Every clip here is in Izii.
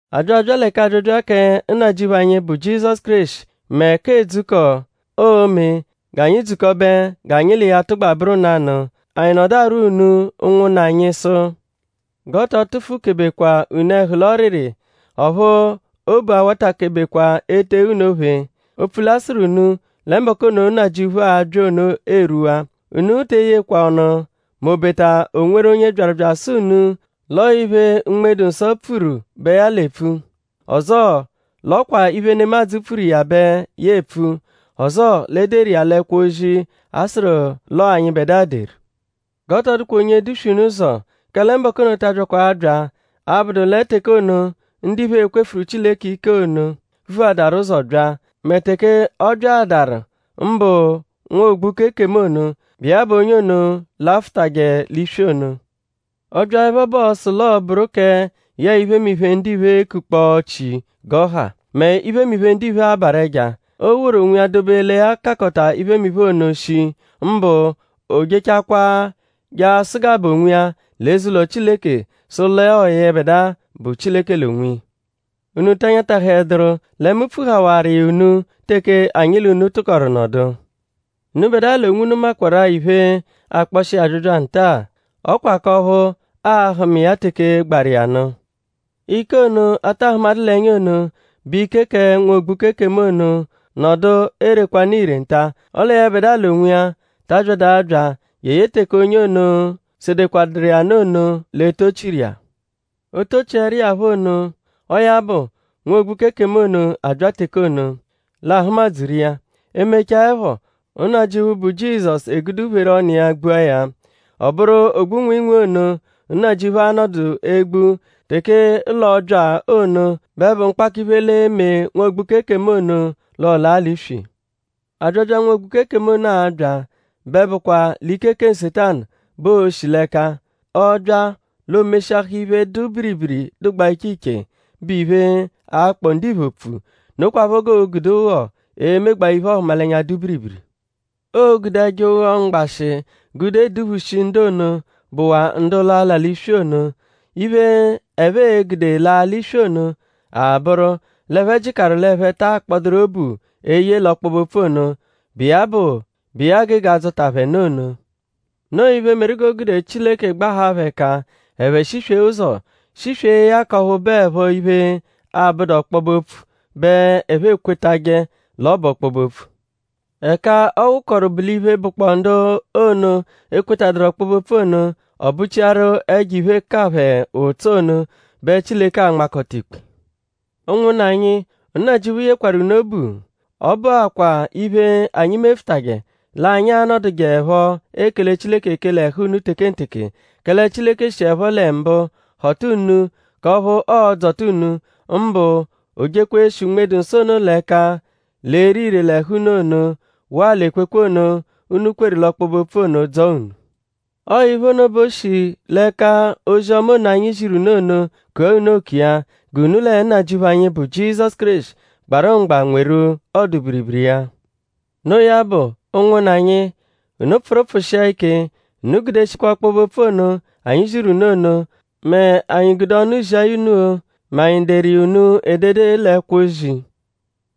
A bya abya lẹ k'abyabya kẹ Nnajịuphu anyi, bụ Jizọsu Kéreshi mẹ k'edzukọ, oo-me g'anyi dzukọbe g'anyi l'iya tụgba bụru nanụ anyi nọdu arwọ unu ụnwunna anyi sụ; g'ọ tọ tụfu-kebekwa unu ẹhu l'ọriri; ọphu obu awatakebekwa ete unu ophe; opfu l'a sụru unu lẹ mbọku ono, Nnajịuphu a-bya ono erwuwaa. Unu te eyejekwa ọnu m'obeta o nweru onye byaru bya asụ unu l'ọo iphe, Unme-dụ-Nsọ pfuru bẹ ya l'epfu; ọzoo l'ọ kwa iphe, nemadzụ pfuru iya bẹ ya epfu; ọzoo l'e deru iya l'ẹkwo-ozi, a sụru l'ọo anyịbedua deru. G'ọ tọ dụkwa onye e-duswe unu ụzo; kẹle mbọku ono ta abyakwa abya abụdu lẹ teke ono, ndiphe e-kwefuru Chileke ike ono vuadaru ụzo bya; mẹ teke ọ byaadaru mbụ nwa-ogbuka-ekemu ono, bụ iya bụ onye ono lafụtaje l'iswi ono. Ọ -byaẹpho bẹ ọo-sụ l'ọo-bụru kẹ yẹe iphemiphe, ndiphe ekukpọo chi g'ọ ha; mẹ iphemiphe ndiphe abarụ ẹja. Oo-woru onwiya dobe lẹ ya kakọta iphemiphe ono shii. Mbụ; oo-jechakwaa je asụgabe onwiya l'eze-ụlo Chileke sụ l'ọo yẹbedua bụ Chileke l'onwiya. ?Unu ta nyatahẹduru lẹ mu pfuhawaru iya unu teke anyi l'unu tụkoru nọdu? Unubẹdua l'onwunu makwarụ-a iphe, akpọshi iya abyabya nta-a. Ọ kwa k'ọphu a-hụma iya teke gbaru iya nụ Ike ono, a ta hụmadu l'ẹnya ono, bụ ike kẹ nwa-ogbuka-ekemu ono nọdu erekwanụ ire nta. Ọle yẹbedua l'onwiya ta abyadụ abya jeye teke onye ono, sedekwadụru iya nụ ono l'e-tochiru iya. O -tochiẹru iya phọ ono; ọo ya bụ nwa-ogbuka-ekemu ono abya teke ono; l'aa-hụma-dzuru iya. E mechaẹpho; Nnajịuphu, bụ Jizọsu egude uphere ọnu iya gbua ya. Ọ bụru nwịinwii ono, Nnajịuphu a-nọdu egbu teke l'ọo-bya ono bẹ bụ mkpakọ-iphe l'e-me nwa-ogbuka-ekemu ono l'ọ laa l'iswi. Abyabya, nwa-mgbuka-ekemu ono a-bya bẹ bụkwa l'ike kẹ Nsetanu bẹ oo-shi l'ẹka. Ọ -bya l'o meshiahaa iphe, dụ biribiri, dụgbaa iche iche, bụ iphe, a-kpọ ndiphe opfu. Nokwaphọ g'oo-gude ụgho emegbaa iphe-ọhumalenya, dụ biribiri. Oo-gude ẹjo ụgho mgbashị gude eduphushi ndu ono, bụwaa ndu l'a-la l'iswi ono. Iphe, ẹphe e-gude laa l'iswi ono a-bụru l'ẹphe jịkaru l'ẹphe ta akpọduru obu eye l'ọkpobe-opfu ono, bụ iya gege adzọta phẹ nụ ono. Noo iphe, meru g'o gude Chileke gbahaa phẹ ẹka; ẹphe shiswee ụzo; shiswee ya k'ọphu bụepho iphe, abụdu ọkpobe-opfu bẹ ẹphe ekwetajẹ l'ọ bụ ọkpobe-opfu. Ẹka ọ wụkoru bụ l'iphe, bụkpoo ndu ono, ekwetaduru ọkpobe-opfu ono; ọ bụchiaru ẹjo-iphe ka phẹ ụtso ono bẹ Chileke a-nmakọta ikpe. Ụnwunna anyi; Nnajịuphu yekwarụ unu obu. Ọ bụakwa iphe, anyi mefụtaje; l'anyi a-nọdujeepho ekele Chileke ekele ẹhu unu tekenteke; kẹle Chileke shiẹpho lẹ mbụ họta unu k'ọphu ọo-dzọta unu; mbụ o jekwa e-shi Unme-dụ-Nsọ ono l'ẹka l'ere ire l'ẹhu unu ono; waa l'ekwekwe ono, unu kweru l'ọkpobe-opfu ono; dzọo unu. Ọo iphe ono bẹ o shi l'ẹka ozi-ọma ono, anyi ziru unu ono kua unu oku iya; g'unu lẹ Nnajịuphu anyi, bụ Jizọsu Kéreshi gbarụ mgba nweru ọdu-biribiri iya. Noo ya bụ; ụnwunna anyi; unu pfụru pfụshia ike; unu gudeshikwa ọkpobe-opfu ono, anyi ziru unu ono; mẹ anyi gude ọnu zia ya unu-o; mẹ anyi deru iya unu edede l'ẹkwo-ozi.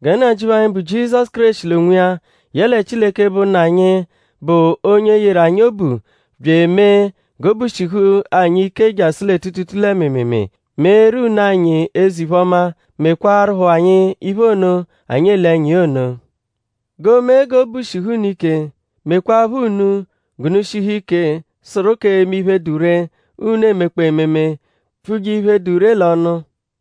Gẹ Nnajịuphu anyi, bụ Jizọsu Kéreshi l'onwiya; yẹle Chileke, bụ Nna anyi, bụ onye yeru anyi obu; bya emee g'obu shihu anyi ike jasụ lẹ tuutuutuu lẹ mịimiimii; meeru unu anyi eze-iphe-ọma; mekwaarụpho anyi iphe ono, anyi ele ẹnya iya ono. G'o mee g'obu shihu unu ike; mekwaaphọ unu g'unu shihu ike sụru k'eme iphe, dụ ree, unu emekpọo ememe; pfuje iphe, dụ ree l'ọnu.